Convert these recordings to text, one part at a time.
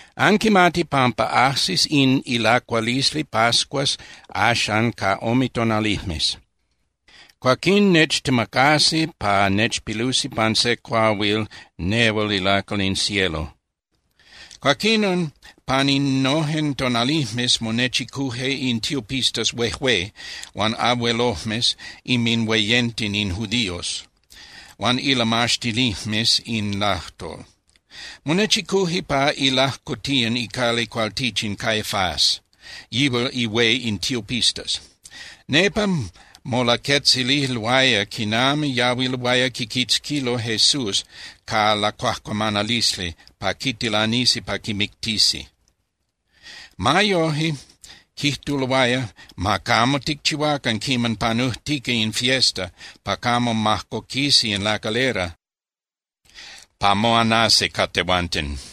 —Anquimati pampa ajsis in ilacualisli pascuas axan ca ome tonalijmes. Cuaquín nechtemacasi pa nechpilusi pan se cuahuil nehual ilacal in cielo. Cuaquinon pan innojen tonalijmes monechicuje in tiopistas huejué huan abuelojmes inminhueyenten in judíos huan ilamaxtinijmes in lajtol. Monechicuje pa ilajcotiyan icali cualtichin Caifás, yihual ihué in tiopistas. Nepa molaquetzililoaya quinami yahuiloaya quiquitzquilo Jesús ca lacuajcuamanalisli pa quitilanisi pa quimictisi. Ma yoje, quijtuloaya: —Ma camo ticchihuacan quiman panujtica in fiesta pa camo majcoquisi in lacalera pa moanasi ca tehuanten.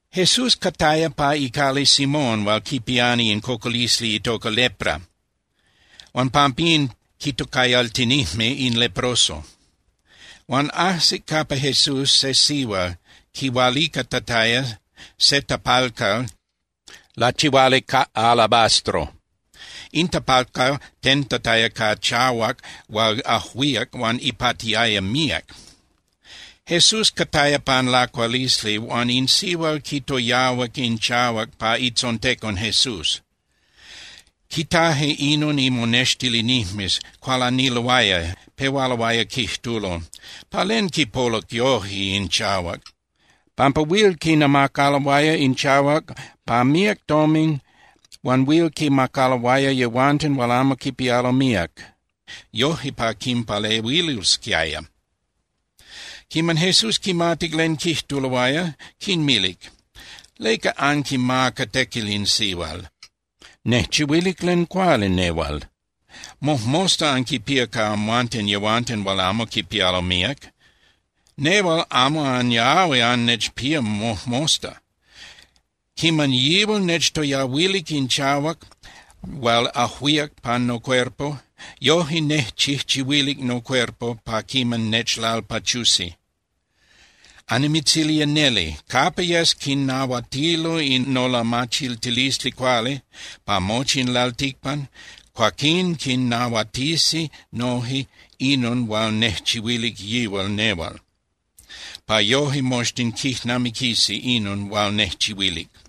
Jesús cataya pa icali Simón hual quipiani in cocolisli itoca lepra huan pampín quitocayaltinijme in Leproso. Huan ajsic capa Jesús se sihual quihualicatataya se tapalcal lachihuali ca alabastro. In tapalcal tentataya ca chahuac hual ajuíac huan ipatiaya míac. Jesús cataya pan lacualisli huan in sihual quitoyahuac in chahuac pa itzontecon Jesús. Quitaje inon imonextilinijmes, cualaniloaya, pehualoaya quijtulo: —¿Pa len quipoluc yoje in chahuac? Pampa huil quinamacaloaya in chahuac pa míac tomin huan huil quinmacaloaya yehuanten hual amo quipialo míac, yoje pa quinpalehuilosquiaya. Quiman Jesús quimatic len quijtuloaya, quinmilic: —¿Leca anquimaca tequil in sihual? Nejchihuilic len cuali nehual. Mojmosta anquinpía ca amhuanten yehuanten hual amo quipialo míac. Nehual amo anyahui annechpía mojmosta. Quiman yihual nechtoyahuilic in chahuac hual ajuíac pan nocuerpo, yoje nejchijchihuilic nocuerpo pa quiman nechlalpachusi. Annimitzilía neli, capa yes quinnahuatilo in nolamachiltilisli cuali pa mochi in lalticpan, cuaquín quinnahuatisi noje inon hual nejchihuilic yihual nehual, pa yoje moxtin quijnamiquisi inon hual nejchihuilic.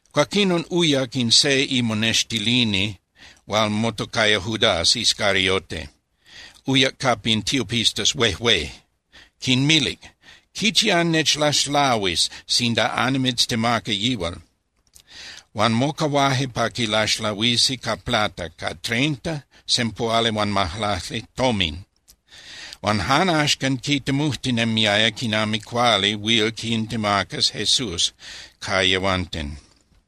Cuaquinon uyac in se imonextilini hual motocaya Judas Iscariote, uyac capa in tiopistas huejué. Quinmilic: —¿Quichi annechlaxlahuis sinda annimitztemaca yihual? Huan mocahuaje pa quilaxlahuisi ca plata, ca treinta (sempuhualihuanmajlacli) tomin. Huan jan axcan quitemujtinemiaya quiman cuali huil quintemacas Jesús ca yehuanten.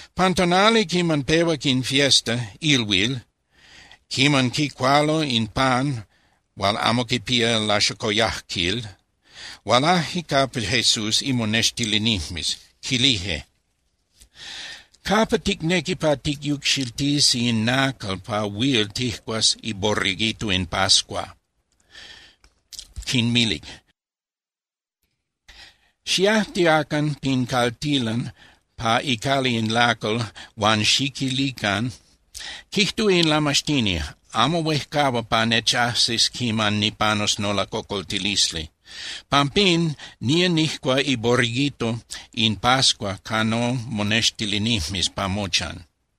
Pan tonali quiman pehuac in fiesta (ilhuil) quiman quicualo in pan hual amo quipía laxocoyajquil, hualaje capa Jesús imonextilinijmes, quilije: —¿Capa ticnequi pa ticyucxiltisi in nacal pa huil tijcuas iborreguito in pascua? Quinmilic: —Xiajtiacan pin caltilan pa icali in lacal huan xiquilican: “Quijtúa in Lamaxtini: Amo huejcahua pa nechajsis quiman nipanus nolacocoltilisli. Pampín nía nijcua iborreguito in pascua ca nomonextilinijmes pa mochan.”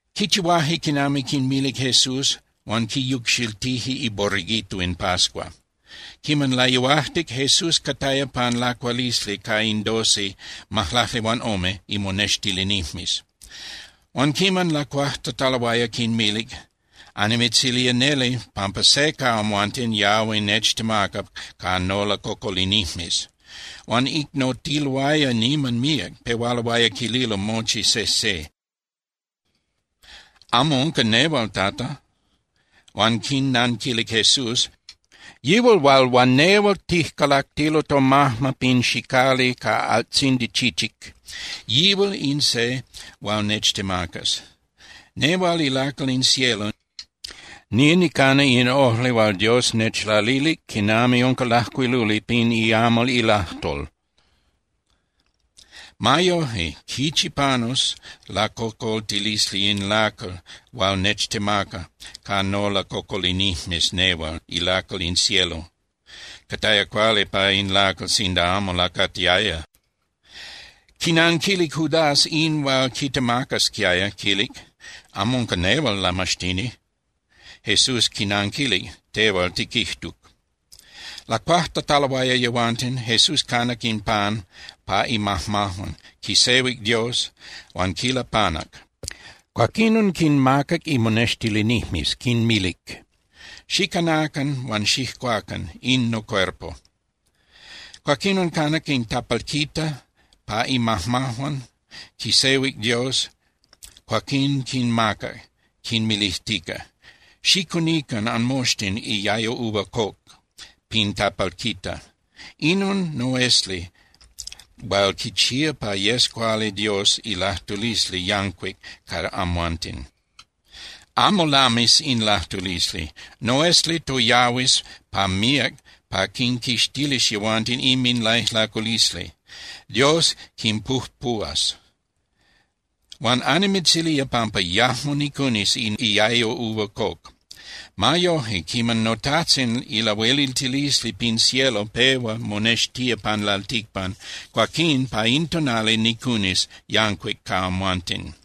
Quichihuaje quinami quinmilic Jesús, huan quiyucxiltije iborreguito in pascua. Quiman layuajtic, Jesús cataya pan lacualisli ca in doce (majlaclihuanome) imonextilinijmes. Huan quiman lacuajtataloaya, quinmilic: —Annimitzilía neli pampa se ca amhuanten yahui nechtemaca ca nolacocolinijmes. Huan icnotiloaya niman míac, pehualoaya quililo mochi sejse: —¿Amo unca nehual, Tata? Huan quinnanquilic Jesús: —Yihual hual huan nehual tijcalactilo tomajma pin xicali ca altzindi chichic, yihual in se hual nechtemacas. Nehual ilacal in cielo, nía nicana in ojli hual Dios nechlalilic quinami unca lajcuiluli pin iamal ilajtol. Ma yoje, ¡quichi panus lacocoltilisli in lacal hual nechtemaca ca nolacocolinijmes nehual ilacal in cielo! Cataya cuali pa in lacal sinda amo lacatiaya. Quinanquilic Judas in hual quitemacasquiaya, quilic: —¿Amo unca nehual, Lamaxtini? Jesús quinanquilic: —Tehual tiquijtuc. Lacuajtataloaya yehuanten, Jesús canac in pan pa imajmajuan, quisehuic Dios, huan quilapanac. Cuaquinon quinmacac imonextilinijmes, quinmilic: —Xicanacan huan xijcuacan. In nocuerpo. Cuaquinon canac in tapalquita pa imajmajuan, quisehuic Dios, cuaquín quinmacac, quinmilijtica: —Xicunican anmoxtin iayo uva coc pin tapalquita. Inon noesli hual quichía pa yes cuali Dios ilajtulisli yancuic ca amhuanten. Amo lamis in lajtulisli. Noesli toyahuis pa míac pa quinquixtilis yehuanten inminlaijlaculisli, Dios quinpujpuhuas. Huan annimitzilía pampa yajmo nicunis in iayo uva coc. Ma yoje, quiman noTajtzin ilahueliltilisli pin cielo pehua monextía pan lalticpan, cuaquín pa in tonali nicunis yancuic ca amhuanten.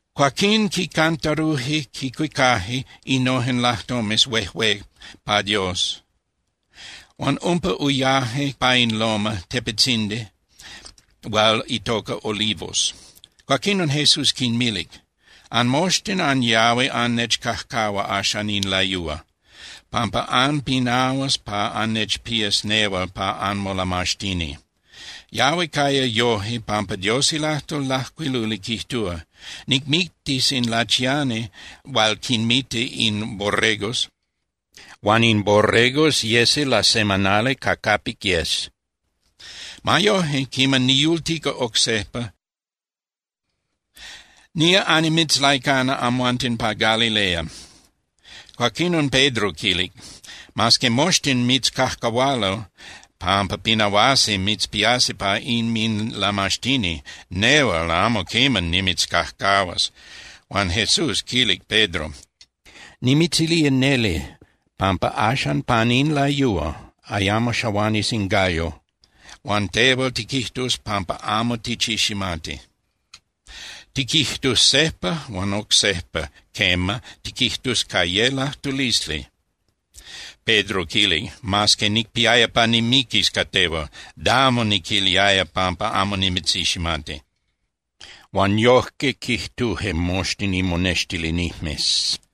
Cuaquín quicantaruje (quicuicaje) innojen lajtomes huejué pa Dios, huan umpa uyaje pa in loma (tepetzindi) hual itoca Olivos. Cuaquinon Jesús quinmilic: —Anmoxtin anyahui annechcajcahua axan in layúa, pampa anpinahuas pa annechpías nehual pa anmolamaxtini. Yahui caya yoje pampa Dios ilajtol lajcuiluli quijtúa: “Nicmictis in lachiani hual quinmita in borregos, huan in borregos yesi lasemanali ca capic yes.” Ma yoje, quiman niyultica oc sejpa, nía annimitzlaicana amhuanten pa Galilea. Cuaquinon Pedro quilic: —Mas que moxtin mitzcajcahualo pampa pinahuasi mitzpiasi pa inminlamaxtini, nehual amo quiman nimitzcajcahuas. Huan Jesús quilic Pedro: —Nimitzilía neli pampa axan pan in layúa ayamo xahuanis in gallo, huan tehual tiquijtus pampa amo tichiximati, tiquijtus sejpa huan oc sejpa, quema, tiquijtus ca ye lajtulisli. Pedro quilic: —Mas que nicpiaya pa nimiquis ca tehual, damo niquiliaya pampa amo nimitziximati. Huan yojque quijtuje moxtin imonextilinijmes.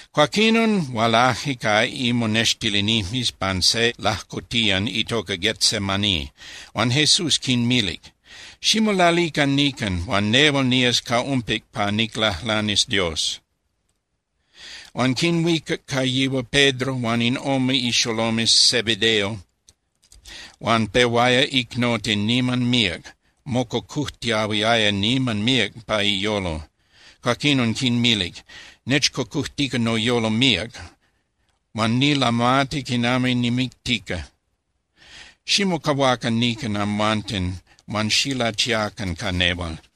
Cuaquinon hualaje ca imonextilinijmes pan se lajcotiyan itoca Getsemaní, huan Jesús quinmilic: —Ximolalican nican huan nehual nías ca umpic pa niclajlanis Dios. Huan quinhuicac ca yihual Pedro huan in ome ixolomes Zebedeo huan pehuaya icnoti niman míac, mococujtiahuiaya niman míac pa iyolo. Cuaquinon quinmilic: —Nechcocojtica noyolo míac, huan nilamati quinami nimictica. Ximocahuacan nican amhuanten huan xilachiacan ca nehual.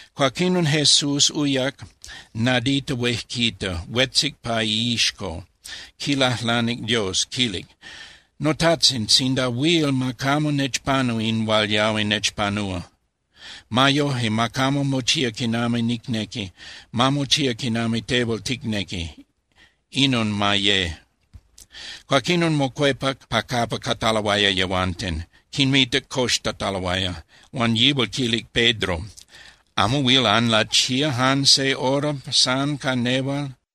Cuaquinon Jesús uyac nadita huejquita, huetzic pa iixco, quilajlanic Dios, quilic: —NoTajtzin, sinda huil, ma camo nechpanu in hual yahui nechpanúa. Ma yoje, ma camo mochía quinami nicnequi, ma mochía quinami tehual ticnequi, inon ma ye. Cuaquinon mocuepac pa capa cataloaya yehuanten, quinmitac coxtataloaya, huan yihual quilic Pedro: —¿Amo huil anlachía jan se hora san ca nehual?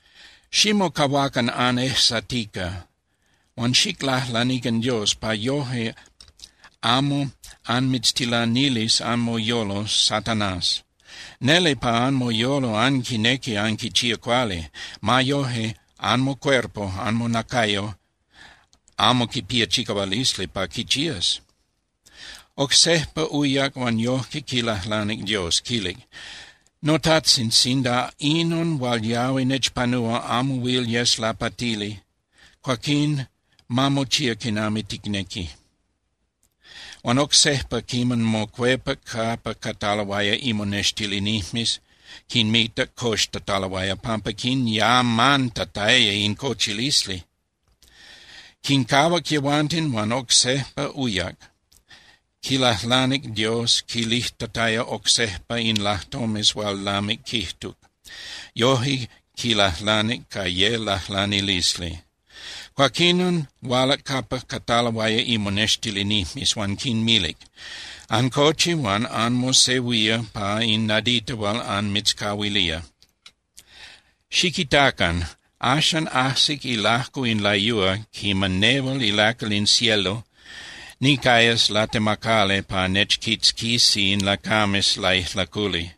Ximocahuacan anejsatica huan xiclajlanican Dios, pa yoje amo anmitztilanilis anmoyolo Satanás. Neli pa anmoyolo anquinequi anquichía cuali. Ma yoje, anmocuerpo (anmonacayo) amo quipía chicahualisli pa quichías. Oc sejpa uyac huan yojque quilajlanic Dios, quilic: —NoTajtzin, sinda inon hual yahui nechpanúa amo huil yes lapatili, cuaquín ma mochía quinami ticnequi. Huan oc sejpa quiman mocuepac capa cataloaya imonextilinijmes, quinmitac coxtataloaya pampa quinyamantataya in cochilisli. Quincahuac yehuanten huan oc sejpa uyac, quilajlanic Dios quilijtataya oc sejpa in lajtomes hual lamic quijtuc. Yoje quilajlanic ca ye lajlanilisli. Cuaquinon hualac capa cataloaya imonextilinijmes huan quinmilic: —Ancochi huan anmosehuía pa in nadita hual anmitzcahuilía. Xiquitacan, axan ajsic ilajco in layúa quiman nehual ilacal in cielo nicayas latemacali pa nechquitzquisi in lacames laijlaculi.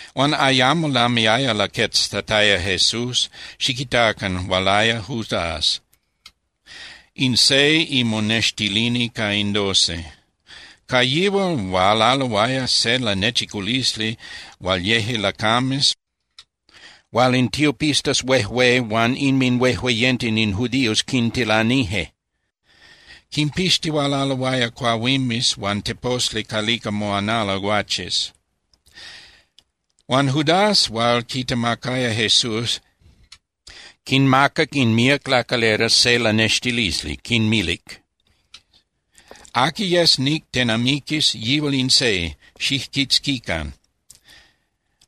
Huan ayamo lamiaya laqueztataya Jesús, xiquitacan, hualaya Judas, in se imonextilini ca in doce. Ca yihual hualaloaya se lanechiculisli hual yeje lacames hual in tiopistas huejué huan inminhuejueyenten in judíos quintilanije. Quimpixtihualaloaya cuahuimes huan teposli calica moanalo guaches. Huan Judas hual quitemacaya Jesús quinmacac in míac lacalera se lanextilisli, quinmilic: —Aqui yes nictenamiquis, yihual in se, xijquitzquican.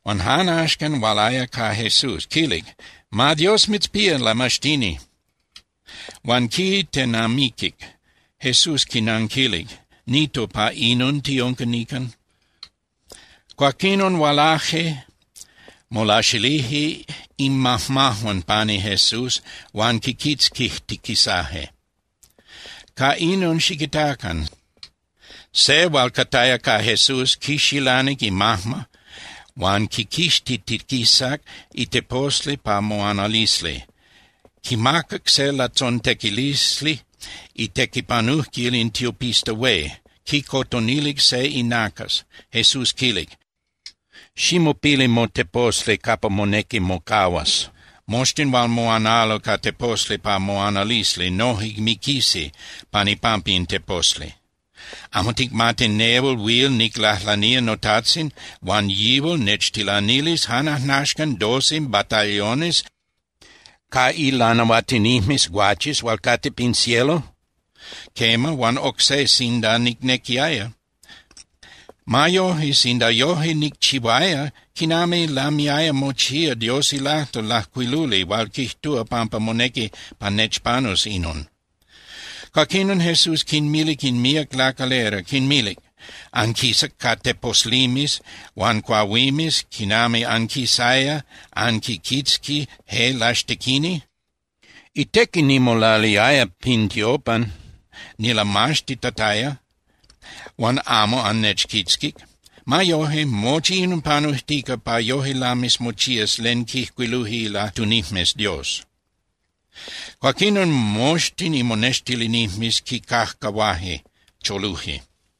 Huan jan axcan hualaya ca Jesús, quilic: —¡Ma Dios mitzpía, Lamaxtini! Huan quitenamiquic. Jesús quinanquilic: —Nito, ¿pa inon tiunca nican? Cuaquinon hualaje, molaxilije inmajmajuan pani Jesús huan quiquitzquijtiquisaje. Ca inon, xiquitacan, se hual cataya ca Jesús quixilanic imajma huan quiquixtitiquisac iteposli pa moanalisli, quimacac se latzontequilisli itequipanujquil in tiopista hué, quicotonilic se inacas. Jesús quilic: —Ximopili moteposli capa monequi mocahuas. Moxtin hual moanalo ca teposli pa moanalisli noje miquisi pan ipampa in teposli. ¿Amo ticmati nehual huil niclajlanía noTajtzin huan Yihual nechtilanilis jan ajnaxcan doce batallones ca ilanahuatinijmes guaches hual cate pin cielo? Quema, huan oc se sinda nicnequiaya. Ma yoje, sinda yoje nicchihuaya, ¿quinami lamiaya mochía Dios ilajtol lajcuiluli hual quijtúa pampa monequi pa nechpanus inon? Cuaquinon Jesús quinmilic in míac lacalera, quinmilic: —¿Anquisac ca teposlimes huan cuahuimes quinami anquisaya anquiquitzqui je laxtequini? Itequi nimolaliaya pin tiopan nilamaxtitataya huan amo annechquitzquic. Ma yoje, mochi inon panujtica pa yoje lamis mochías len quijcuiluje ilajtunijmes Dios. Cuaquinon moxtin imonextilinijmes quicajcahuaje, choluje.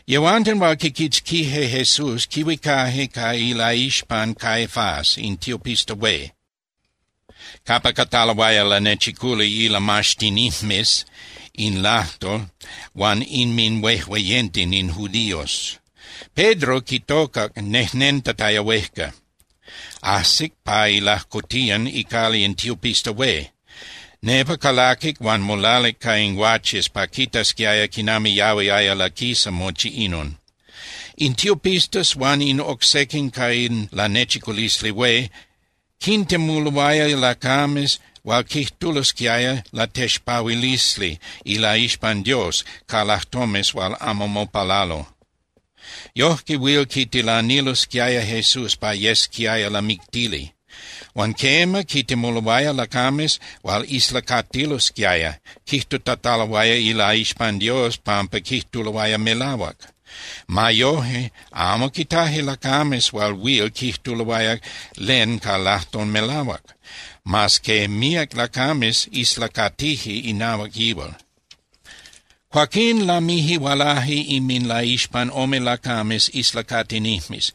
Yehuanten hual quiquitzquije Jesús quihuicaje ca ilaixpan Caifás in tiopista hué, capa cataloaya lanechiculi ilamaxtinijmes in lajtol huan inminhuejueyenten in judíos. Pedro quitocac nejnentataya huejca. Ajsic pa ilajcotiyan icali in tiopista hué. Nepa calaquic huan molalic ca in guaches pa quitasquiaya quinami yahuiaya laquisa mochi inon. In tiopistas huan in oc sequin ca in Lanechiculisli Hué quintemuloaya lacames hual quijtulosquiaya latexpahuilisli ilaixpan Dios ca lajtomes hual amo mopalalo. Yojque huil quitilanilosquiaya Jesús pa yesquiaya lamictili. Huan quema, quintemuloaya lacames hual islacatilosquiaya quijtutataloaya ilaixpan Dios pampa quijtuloaya melahuac. Ma yoje, amo quitaje lacames hual huil quijtuloaya len ca lajtol melahuac, mas que míac lacames islacatije inahuac yihual. Cuaquín lamije hualaje inminlaixpan ome lacames islacatinijmes.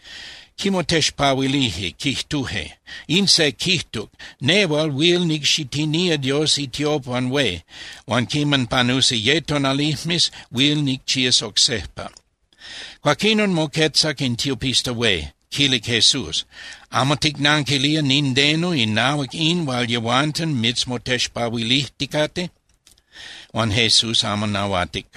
Quimotexpahuilije, quijtuje: —In se quijtuc: “Nehual huil nicxitinía Dios itiopan hué huan quiman panusi ye tonalijmes huil nicchías oc sejpa.” Cuaquinon moquetzac in tiopista hué, quilic Jesús: —¿Amo ticnanquilía nindeno inahuac in hual yehuanten mitzmotexpahuilijticate? Huan Jesús amo nahuatic.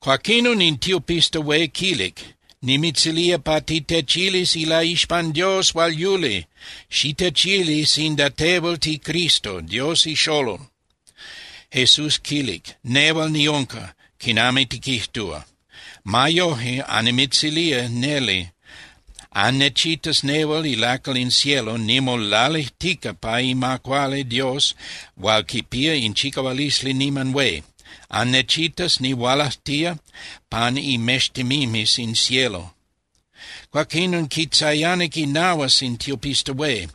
Cuaquinon in tiopista hué quilic: —¡Nimitzilía pa titechilis ilaixpan Dios hual yuli, xitechili sinda tehual tiCristo, Dios ixolol! Jesús quilic: —Nehual niunca, quinami tiquijtúa. Ma yoje, annimitzilía neli, annechitas nehual ilacal in cielo nimolalijtica pa ima cuali Dios hual quipía in chicahualisli niman hué. Annechitas nihualajtía pan imextemimes in cielo. Cuaquinon quitzayanic inahuas in tiopista hué.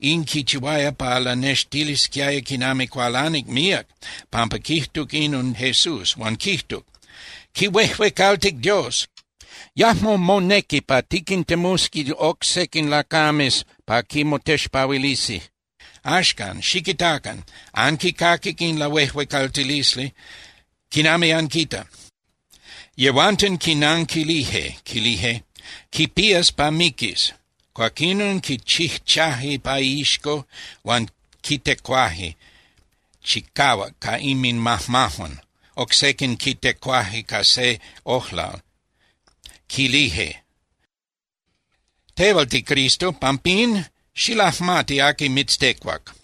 In quichihuaya pa lanextilisquiaya quinami cualanic míac pampa quijtuc inon Jesús, huan quijtuc: —¡Quihuejuecaltic Dios! ¡Yajmo monequi pa tiquintemusi oc sequin lacames pa quimotexpahuilisi! ¡Axcan, xiquitacan! ¡Anquicaquic in lahuejuecaltilisli! ¿Quinami anquita? Yehuanten quinanquilije, quilije: —Quipías pa miquis. Cuaquinon quichijchaje pa iixco huan quitecuaje chicahuac ca inminmajmajuan. Oc sequin quitecuaje ca se ojlal, quilije: —Tehual tiCristo, pampín, ¡xilajmati aqui mitztecuac!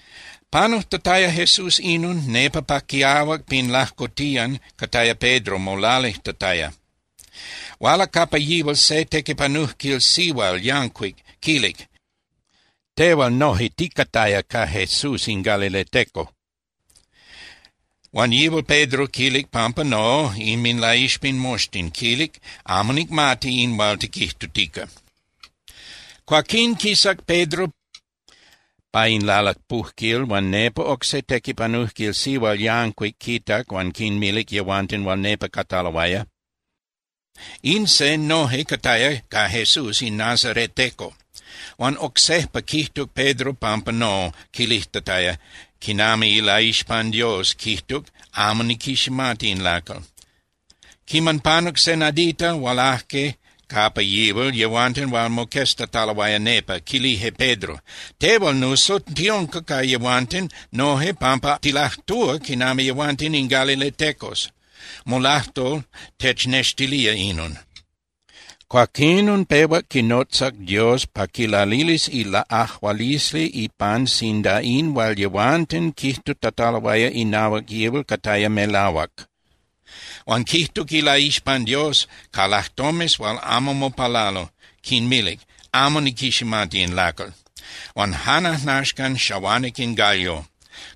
Panujtataya Jesús inon, nepa pa quiahuac pin lajcotiyan cataya Pedro molalijtataya. Hualac capa yihual se tequipanujquil sihual yancuic, quilic: —Tehual noje ticataya ca Jesús in galileteco. Huan yihual Pedro quilic pampa no inminlaixpan moxtin, quilic: —Amo nicmati in hual tiquijtutica. Cuaquín quisac Pedro pa in lalapujquil huan nepa oc se tequipanujquil sihual yancuic quitac huan quinmilic yehuanten hual nepa cataloaya: —In se noje cataya ca Jesús in nazareteco. Huan oc sejpa quijtuc Pedro pampa no, quilijtataya quinami ilaixpan Dios, quijtuc: —Amo niquiximati in lacal. Quiman panuc se nadita, hualaje capa yihual yehuanten hual moqueztataloaya nepa, quilije Pedro: —Tehual nuso tiunca ca yehuanten noje pampa tilajtúa quinami yehuanten in galiletecos. Molajtol technextilía inon. Cuaquinon pehuac quinotzac Dios pa quilalilis ilaꞌajualisli ipan sinda in hual yehuanten quijtutataloaya inahuac yihual cataya melahuac. Huan quijtuc ilaixpan Dios ca lajtomes hual amo mopalalo, quinmilic: —Amo niquiximati in lacal. Huan jan ajnaxcan xahuanic in gallo.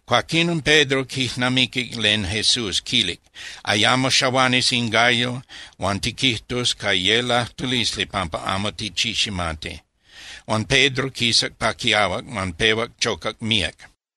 Cuaquinon Pedro quijnamiquic len Jesús quilic: “Ayamo xahuanis in gallo, huan tiquijtus ca ye lajtulisli pampa amo tichiximati.” Huan Pedro quisac pa quiahuac huan pehuac chocac míac.